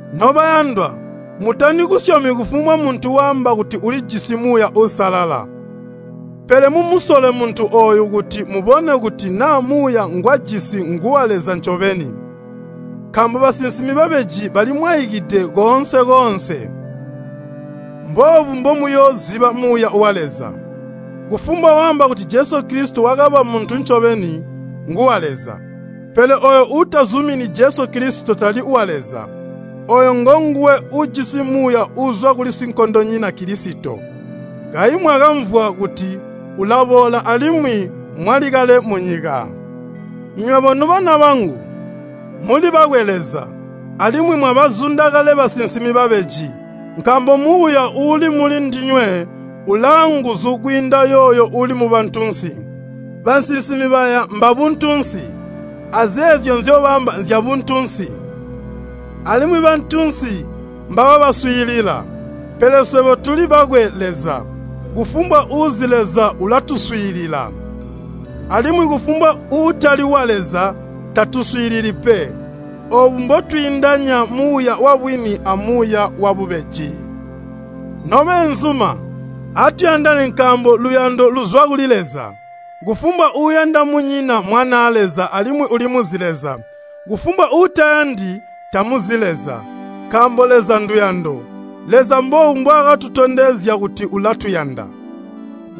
Nobayandwa, mutali kusyomi kufumbwa muntu waamba kuti ulijisi Muuya Uusalala. Pele mumusole muntu ooyo kuti mubone kuti naa muuya ngwajisi nguwa Leza ncobeni. Nkaambo basinsimi babeji balimwaikide koonse-koonse. Mboobu mbomuyooziba Muuya wa Leza, kufumbwa waamba kuti Jesu Kilisito wakaba muntu ncobeni, nguwa Leza. Pele ooyo uutazumini Jesu Kilisito tali wa Leza. Ooyo ngonguwe ujisi muuya uuzwa kuli sinkondonyina Kilisito. Kayi mwakamvwa kuti ulaboola alimwi mwali kale munyika. Nywebo nobana bangu, muli bakwe Leza, alimwi mwabazunda kale basinsimi babeji, nkaambo Muuya uuli muli ndinywe ulaanguzu kwiinda yooyo uuli mubantunsi. Bansinsimi baya mbabuntunsi, azeezyo nzyobaamba nzyabuntunsi, alimwi bantunsi mbababaswiilila. Pele swebo tuli bakwe Leza. Kufumbwa uuzi Leza ulatuswiilila, alimwi kufumbwa uutali wa Leza tatuswiilili pe. Oobu mbotwiindanya Muuya wabwini amuuya wabubeji. Nobeenzuma, atuyandane nkaambo luyando luzwa kuli Leza. Kufumbwa uuyanda munyina mmwanaa Leza alimwi ulimuzi Leza. Kufumbwa uutayandi, tamuzi Leza, nkaambo Leza nduyando. Leza mboobu mbwaakatondezya kuti ulatuyanda,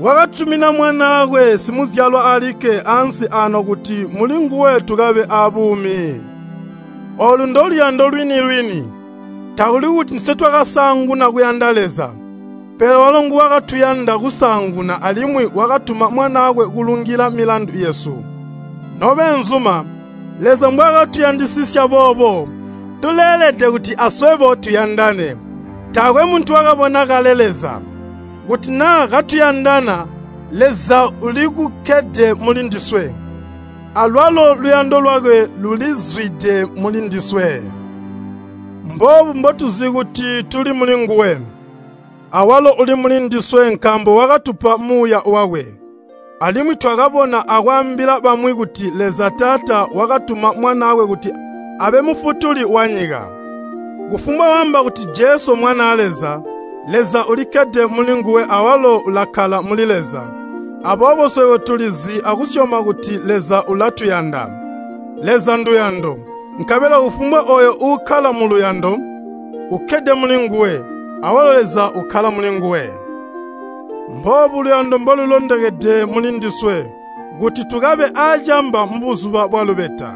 wakatutumina Mwanaakwe simuzyalwa alikke ansi aano kuti mulinguwe tukabe aabuumi. Oolu ndoluyando lwini-lwini. Takuli kuti ndiswe twakasaanguna kuyanda Leza, pele walo nguwakatuyanda kusaanguna alimwi wakatuma Mwanaakwe kulungila milandu yesu. Nobeenzuma, Leza mbwaakatuyandisisya boobo, tuleelede kuti aswebo tuyandane. Taakwe muntu wakabona kale Leza. Kuti naa katuyandana, Leza ulikukkede muli ndiswe, alwalo luyando lwakwe lulizwide muli ndiswe. Mboobu mbotuzi kuti tuli mulinguwe, awalo uli muli ndiswe nkaambo wakatupa Muuya wakwe. Alimwi twakabona akwaambila bamwi kuti Leza Taata wakatuma Mwanaakwe kuti abe Mufutuli wanyika. Kufumbwa waamba kuti Jesu Mwanaa Leza, Leza ulikkede mulinguwe awalo ulakkala muli Leza. Aboobo swebo tulizi akusyoma kuti Leza ulatuyanda. Leza nduyando, nkabela kufumbwa ooyo uukkala muluyando, ukkede mulinguwe, awalo Leza ukkala mulinguwe. Mboobu luyando mbolulondokede muli ndiswe kuti tukabe aacaamba mubuzuba bwalubeta,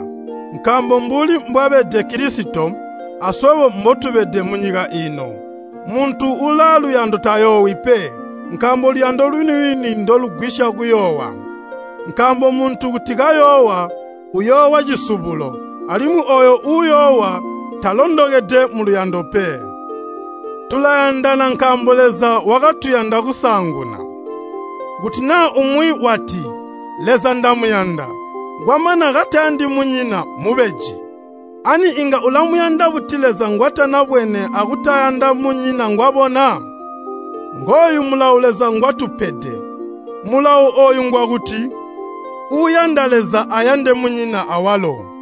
nkaambo mbuli mbwabede Kilisito, aswebo mbotubede munyika iino. Muntu ulaaluyando tayoowi pe, nkaambo luyando lwini-lwini ndolugwisya kuyoowa. Nkaambo muntu kuti kayoowa, uyoowa cisubulo, alimwi ooyo uyoowa, talondokede muluyando pe. Tulayandana nkaambo Leza wakatuyanda kusaanguna. Kuti naa umwi wati, “Leza ndamuyanda,” kwamana katayandi munyina mmubeji. Ani inga ulamuyanda buti Leza ngwatanabwene akutayanda munyina ngwabona? Ngooyu mulawo Leza ngwatupede, mulawo ooyu ngwakuti, uuyanda Leza ayande munyina awalo.